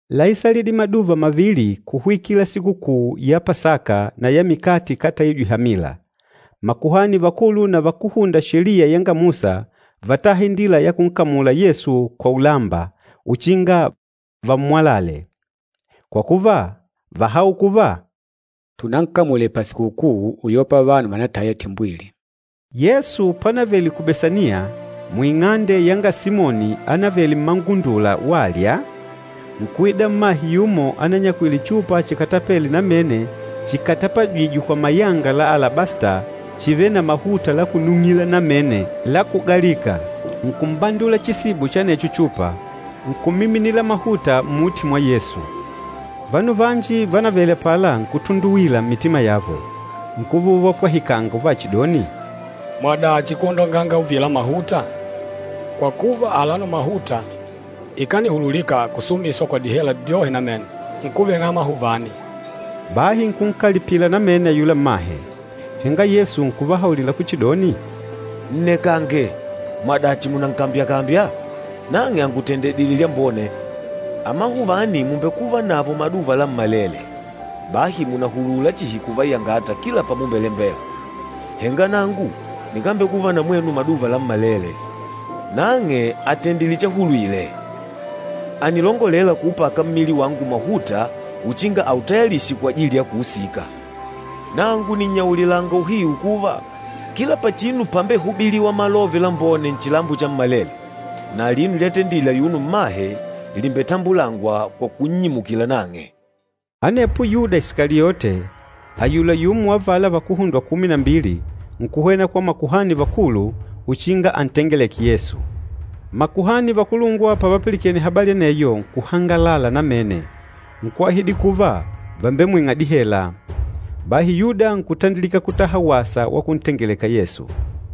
Láisalidile maduva mavili kuhwikila Sikukuu ya Pasaka na ya Mikate Ikátaijwe Hamila. Makuhani vakulu na vakúhunda Sheliya yanga Musa vátaha indila ya kunkamula Yesu kwa ulamba, uchinga vammwalale. Kwa kuva, váhaula kuva, “Tunankamule pasikukuu uyopa vanu vànataya timbwili.” Yesu pánavèlè ku Besaniya, muing'ande yanga Simoni ánavele mmangundula walya, nkuida mmahe yumo ananyakwile chupa chikatapele namene chikatapajîjwe kwa mayanga la alabasta chivêle na mahuta la kunung'ila namene la kugalika. Nkumbandula chisibo cha anecho chupa, nkumiminila mahuta mmuti mwa Yesu. Vanu vanji vánavele apala nkutunduwila mmitima yavo, nkuva uvapwahikanga uvachidoni, “Mwadachi kwondonganga uvila mahuta? Kwa kuva, alano mahuta ikanihululika kusumiswa kwa dihela dyohe namene, nkuveng'a amahuvani.” Bahi nkunkalipila namene ayula mmahe. Henga Yesu nkuvahaulila kuchidoni, “Nnekange, mwadachi mùnankambyakambya? Nang'e àngutendedile lyambone. Amahuvani mùmbekuva navo maduva lammalele, bahi mùnahulula chihi kuvayangata kila pamulembela, henga nangu nikambekuva na mwenu maduva lammalele. Nang'e àtendile chahulwile, ànilongolela kuupaka mmili wangu mahuta uchinga autayalishe kwajili ya kuusika. Nangu nìnnyaulilanga uhiu kuva, kila pachinu pámbehubilìwà Malove Lambone nchilambo chammalele, na alino lyatendile ayuno mmahe lìmbetambulangwa kwa kunnyimukila nang'e.” Anepo Yuda Isikaliote, ayula yumo wa avala vakuhundwa kumi na mbili, nkuhwena kwa makuhani vakulu, uchinga antengeleke Yesu. Makuhani vakulungwa pavapilikene habali aneyo nkuhangalala namene, nkuahidi kuva vàmbemwing'a dihela. Bahi Yuda nkutandilika kutaha wasa wa kuntengeleka Yesu.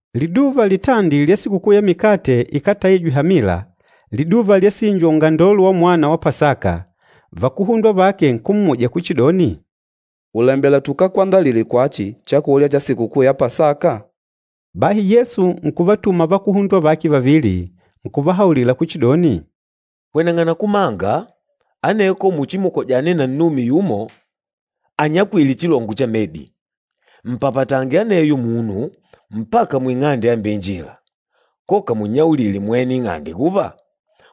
Liduva litandi lya Sikukuu ya Mikate Ikátaijwe Hamila, liduva lyasinjwa ungandolo wamwana wa Pasaka, vakuhundwa vake nkummuja kuchidoni, “Ùlembela tukakwandalile kwachi chakulya cha Sikukuu ya Pasaka?” Bahi Yesu nkuvatuma vakuhundwa vake vavili, nkuvahaulila kuchidoni, “Hweneng'ana kumanga, aneko muchimukojane na nnume yumo anyakwîle chilongo cha medi. Mpapatange aneyo munu, mpaka muing'ande yambeinjila, koka munnyaulile mwene ing'ande kuva,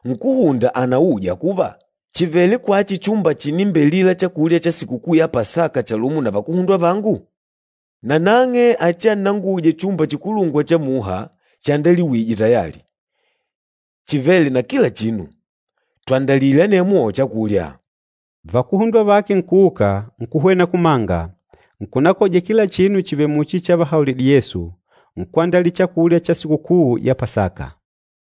‘Nkúhunda ànauja kuva, chìvele kwachi chumba chinimbelila chakulya cha Sikukuu ya Pasaka chalumo na vakuhundwa vangu?’ Nanang'e achiannanguje chumba chikulungwa cha muha, chiandaliwije tayali, chivêle na kila chinu. Twandalile anemwo chakulya.” Vakuhundwa vake nkuuka, nkuhwena kumanga, nkunakoja kila chinu chivèlè muchi chavahaulidile Yesu, nkwandalila chakulya cha Sikukuu ya Pasaka.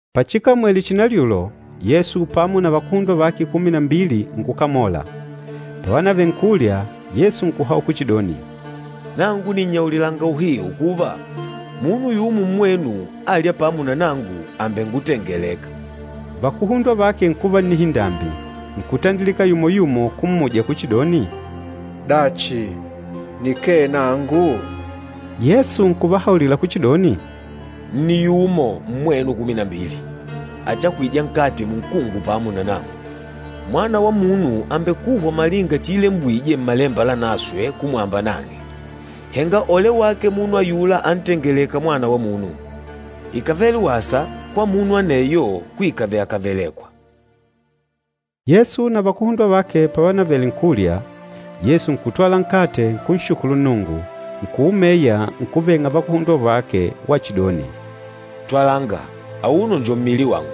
Pachikamwele chinalyulo, Yesu pamo na vakuhundwa vake kumi na mbili nkukamola. Pávanavèlè nkulya, Yesu nkuhaula kuchidoni, “Nangu nìnnyaulilanga uhiu kuva, munu yumo mmwenu âlya pamo na nangu, àmbengutengeleka.” Vakuhundwa vake nkuva na nnihindambi, nkutandilika yumo-yumo kummuja kuchidoni, “Dachi, nikee nangu?” Yesu nkuvahaulila kuchidoni, “Nni yumo mmwenu kumi na mbili, achahwîja nkate munkungu pamo na nangu. Mwana wa Munu àmbekuhwa malinga chiilembwije Mmalemba Lanaswe kumwamba nang'e, henga ole wake munu ayula antengelêka Mwana wa Munu! Ikàvele wasa kwa munu aneyo kuikave akavelekwa.” Yesu na vakuhundwa vake pavanavele nkulya, Yesu nkutwala nkate, nkunshukulu Nnungu, nkuumeya, nkuveng'a vakuhundwa vake, wachidoni, “Twalanga, auno njo mmili wangu.”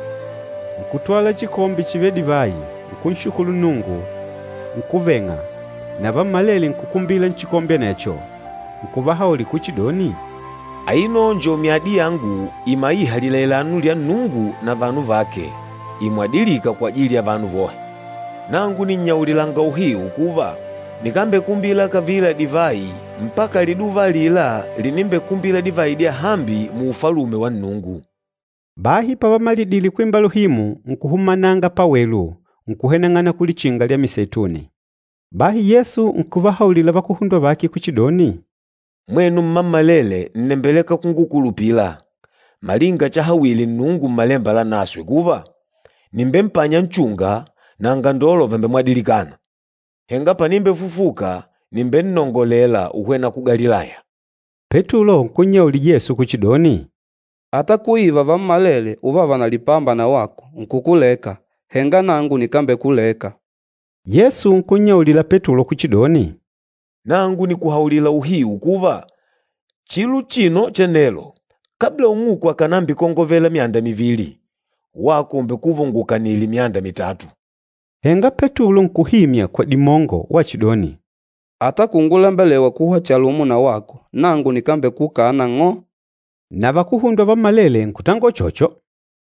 Nkutwala chikombe chivêle divayi, nkunshukulu Nnungu, nkuveng'a, na vammalele nkukumbila nchikombe anecho. Nkuvahaulila kuchidoni, “Aino njo myadi yangu imaîha lilailano lya Nnungu na vanu vake, imwadilîka kwajili ya vanu vohe. Nangu nìnnyaulilanga uhiu kuva, nikambekumbila kavila divayi mpaka liduva alila linimbekumbila divayi dyahambi mu Ufalume wa Nnungu.” Bahi pavamalidile kwimba luhimu, nkuhumananga pawelu, nkuhweneng'ana ku Lichinga lya Miseituni. Bahi Yesu nkuvahaulila vakuhundwa vake kuchidoni, “Mwenu mmammalele nnembeleka kungukulupila, malinga chahawile Nnungu Mmalemba Lanaswe kuva, ‘Nìmbempanya nchunga, na angandolo vàmbemwadilikana.’ Henga panimbefufuka, nìmbennongolela uhwena ku Galilaya.” Petulo nkunnyaulila Yesu kuchidoni, “Ata kuiva vammalele uvava na lipamba na wako nkukuleka, henga nangu nikambekuleka!” Yesu nkunnyaulila Petulo kuchidoni, “Nangu nìkuhaulila uhiu kuva, chilo uchino cha nelo, kabla ung'uku akànambikongovela myanda mivili, wako ùmbekuva ungukanìlè myanda mitatu.” Henga Petulo kuhimya kwa dimongo wachidoni, “Ata kungulembelewa kuhwa chalumo na wako, nangu nikambekukana ng'o.” Na vakuhundwa vammalele nkutangola uchocho.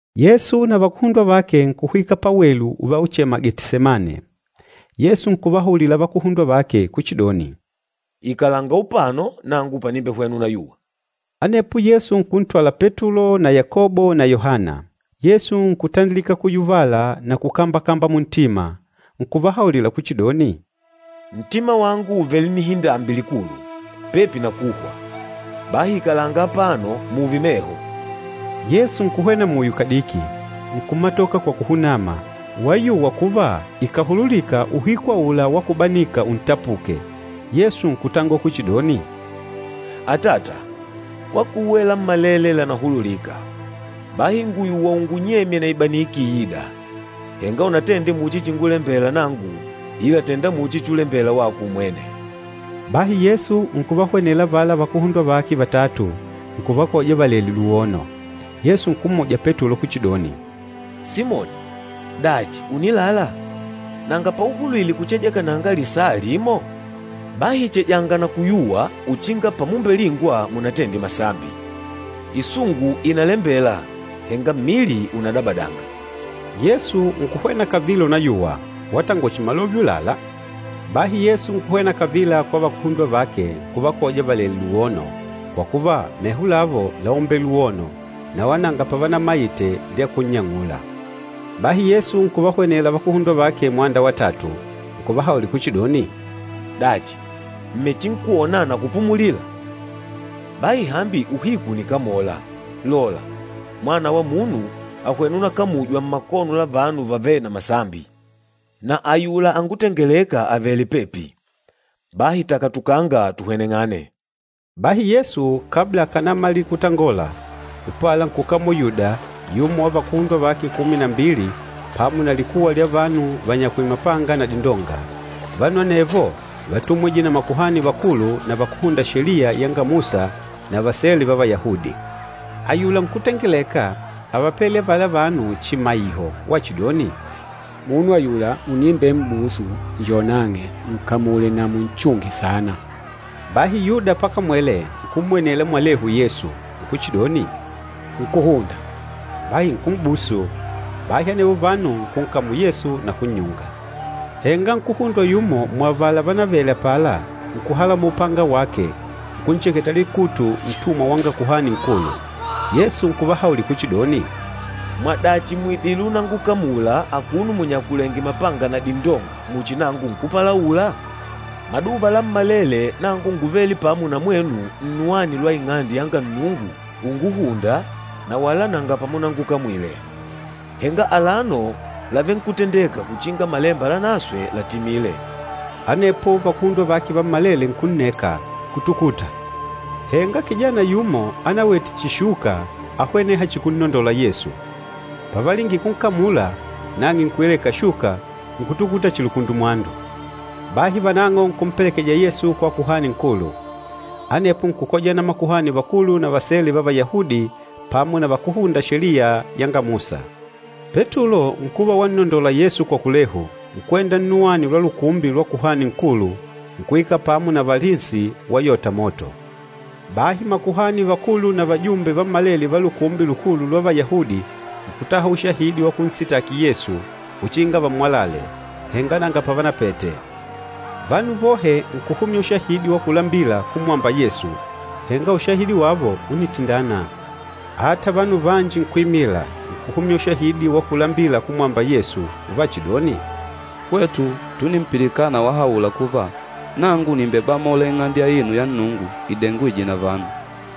Yesu na vakuhundwa vake nkuhwika pawelu uvauchema Getisemane. Yesu nkuvahaulila vakuhundwa vake kuchidoni, “Ikalanga upano nangu panimbehwena unayuwa.” Anepo Yesu nkuntwala Petulo na Yakobo na Yohana. Yesu nkutandilika kuyuvala na kukambakamba muntima. Nkuvahaulila kuchidoni, “Ntima wangu ùvele na nnihindambi likulu, pepi na kuhwa. Bahi ikalanga apano, mùùve meho.” Yesu nkuhwena muyo kadiki, nkumatoka kwa kuhunama, wayuwa kuva ikàhululika uhiku aula wa kubanika untapuke. Yesu nkutangola kuchidoni, “Atata, kwakuwe lammalele lànahululika, bahi ngùyuwa ungunyemye na ibaniki iîda! Henga unatende muchi chingulembela nangu, ila tènda muchi chulembela wako umwene.” Bahi Yesu nkuvahwenela avala vakuhundwa vake vatatu, nkuvakoja valèlè luwono. Yesu nkummuja Petulo kuchidoni, “Simoni, dachi ùnilala? Nanga pauhulwile kucheja kananga lisaa limo? Bahi chejanga na kuyuwa uchinga pamumbelingwa munatende masambi, isungu ìnalembela henga mmili unadabadanga.” Yesu nkuhwena kavila unayuwa, watangola chihi malove ulâla. Bahi Yesu nkuhwena kavila kwa vakuhundwa vake nkuvakoja valèlè luwono, kwa kuva meho lavo láumbele luwono, na wala nanga pavanamaite lya kunnyang'ula. Bahi Yesu nkuvahwenela vakuhundwa vake mwanda wa tatu nkuvahaulila kuchidoni, “Dachi, mmechinkwona na kupumulila? Bahi hambi uhiku ùnikamola! Lola, Mwana wa Munu, àhwena unakamujwa mmakono la vanu vavêle na masambi. Na ayula angutengelêka àvele pepi, bahi takatukanga tuhweneng'ane.” Bahi Yesu kabla akànamalila kutangola, upala nkukamola Yuda, yumo wa vakuhundwa vake kumi na mbili pamo na likuwa lya vanu ványakwìlè mapanga na dindonga. Vanu anevo vátumwije na makuhani vakulu na vakúhunda Sheliya yanga Musa na vasele va Vayahudi. Ayula nkútengeleka ávapele avala vanu chimaiho wachidoni, “Munu ayula unimbem'busu, njo nang'e, nkamule na munchunge saana.” Bahi Yuda pakamwele, nkummwenela mwalehu Yesu, nkuchidoni, “Nkúhunda!” Bahi nkum'busu. Bahi anevo vanu nkunkamula Yesu na kunnyunga. Henga nkuhundwa yumo muavala vánavele apala nkuhalamola upanga wake nkuncheketa likutu ntumwa wanga Kuhani Nkulu. Yesu nkuvahaulila kuchidoni, “Mwadachi mùidile unangukamula akuno munyakulèngè mapanga na dindonga muchi nangu nkúpalaula? Maduva lammalele nangu ngúvele pamo na mwenu nnuwani lwa Ing'ande yanga Nnungu unguhùndà na wala nanga pamunangukamwile. Henga alano làvenkutendeka uchinga Malemba Lanaswe latimile.” Anepo vakuhundwa vake vammalele nkunneka, nkutukuta. Henga kijana yumo anawete chihi shuka áhweneha chihi kunnondola Yesu. Pavalingile kunkamula, nang'e nkuileka shuka, nkutukuta chihi lukundumwandu. Bahi vanang'o nkumpelekeja Yesu kwa Kuhani Nkulu. Anepo nkukojana makuhani vakulu na vasele va Vayahudi pamo na vakúhunda Sheliya yanga Musa. Petulo nkuva wannondola Yesu kwa kulehu, nkwenda nnuwani lwa lukumbi lwa Kuhani Nkulu, nkuikala pamo na valinsi wayota moto. Bahi makuhani vakulu na vajumbe vammalele va Lukumbi Lukulu lwa Vayahudi nkutaha ushahidi wa kunsitaki Yesu uchinga vammwalale, henga nanga pavanapete. Vanu vohe nkuhumya ushahidi wa kulambila kumwamba Yesu, henga ushahidi wavo únitindana. Ata vanu vanji nkuimila, nkuhumya ushahidi wa kulambila kumwamba Yesu, uvachidoni, “Hwetu túnimpilikana wahaula kuva, ‘Nangu nìmbebamola Ing'ande aino ya Nnungu idengwîje na vanu,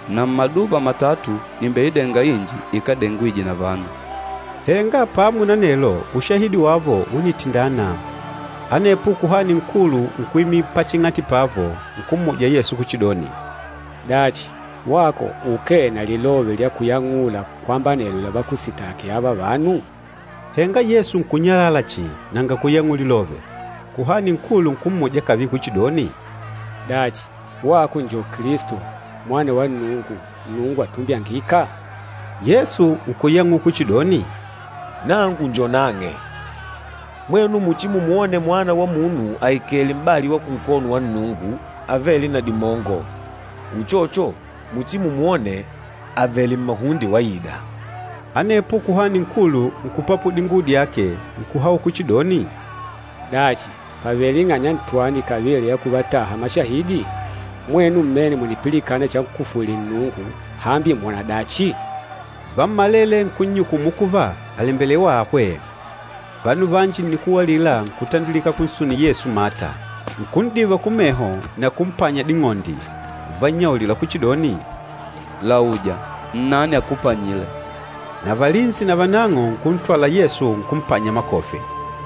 na mmaduva matatu nìmbeidenga inji ikádengwije na vanu.’” Henga pamo na anelo, ushahidi wavo únitindana. Anepo Kuhani Nkulu nkuimila paching'ati pavo nkummuja Yesu kuchidoni, “Dachi, wako ukee na lilove lya kuyang'ula kwamba anelo lavakusitaki ava vanu?” Henga Yesu nkunnyalala chihi nanga kuyang'ula lilove. Kuhani Nkulu nkummuja kavila kuchidoni, “Dachi, wako njo Kilisto, Mwana wa Nnungu, Nnungu Atumbyangîka?” Yesu nkuyang'ula kuchidoni, “Nangu njo nang'e! Mwenu muchimumwone Mwana wa Munu aikèlè m'bali wa kunkono wa Nnungu Avêle na Dimongo, uchocho muchimumwone avèlè mmahunde waida.” Anepo Kuhani Nkulu nkupapula dinguwo dyake, nkuhaula kuchidoni, “Dachi, pàvele ing'anya ntwani kavila ya kuvataha mashahidi? Mwenu mmene mùnipilikana chankufwile Nnungu! Hambi mwòna dachi?” Vammalele nkunnyukumu kuva, àlembelewa ahwe. Vanu vanji nnikuwa alila nkutandilika kunsunila Yesu mata, nkun'diva kumeho na kumpanya ding'ondi, uvannyaulila kuchidoni, “Lauja, nnani akupanyile!” Na valinsi navanang'o nkuntwala Yesu nkumpanya makofi.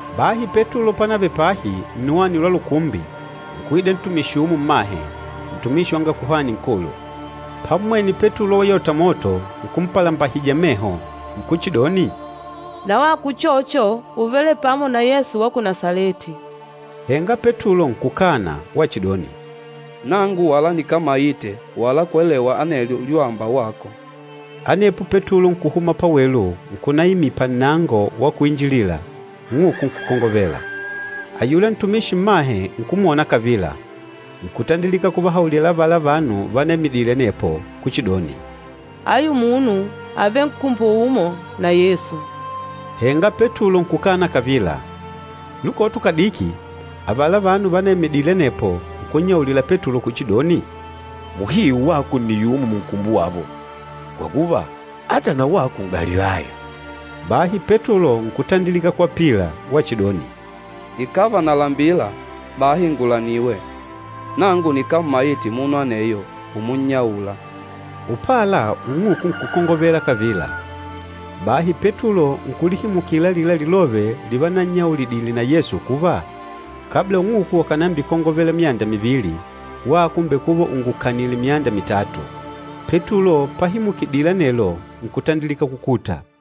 Bahi Petulo pánavele pahi, nnuwani lwa lukumbi, nkuida ntumishi yumo mmahe, ntumishi wanga Kuhani Nkulu. Pammwene Petulo wayota moto, nkumpalambahija meho, nkuchidoni, “Na wako uchocho úvele pamo na Yesu wa ku Nasaleti.” Henga Petulo nkukana wachidoni, “Nangu wala nikámaite wala kwelewa anelyo lyuwamba wako!” Anepo Petulo nkuhuma pawelu nkunaimila pannango wa kuinjilila, ung'uku nkukongovela. Ayula ntumishi mmahe nkumwona kavila, nkutandilika kuvahaulila avala vanu vanaimidile anepo kuchidoni, “Ayu munu àvele nkumbo umo na Yesu.” Henga Petulo nkukana kavila. Lukoto kadiki, avala vanu vanaimidile anepo nkunnyaulila Petulo kuchidoni, “Muhiu wako nni yumo munkumbo wavo, kwa kuva, ata na wako N'galilaya.” Bahi Petulo nkutandilika kwapila wachidoni, “Ikàva nalambila, bahi ngulaniwe! Nangu nikámmaite munu aneyo umunnyaula.” Upala ung'uku nkukongovela kavila. Bahi Petulo nkulihimukila alila lilove livanannyaulidile na Yesu kuva, “Kabla ung'uku akànambikongovela myanda mivili, wako ùmbekuva ungukanìlè myanda mitatu.” Petulo pahimukidile anelo nkutandilika kukuta.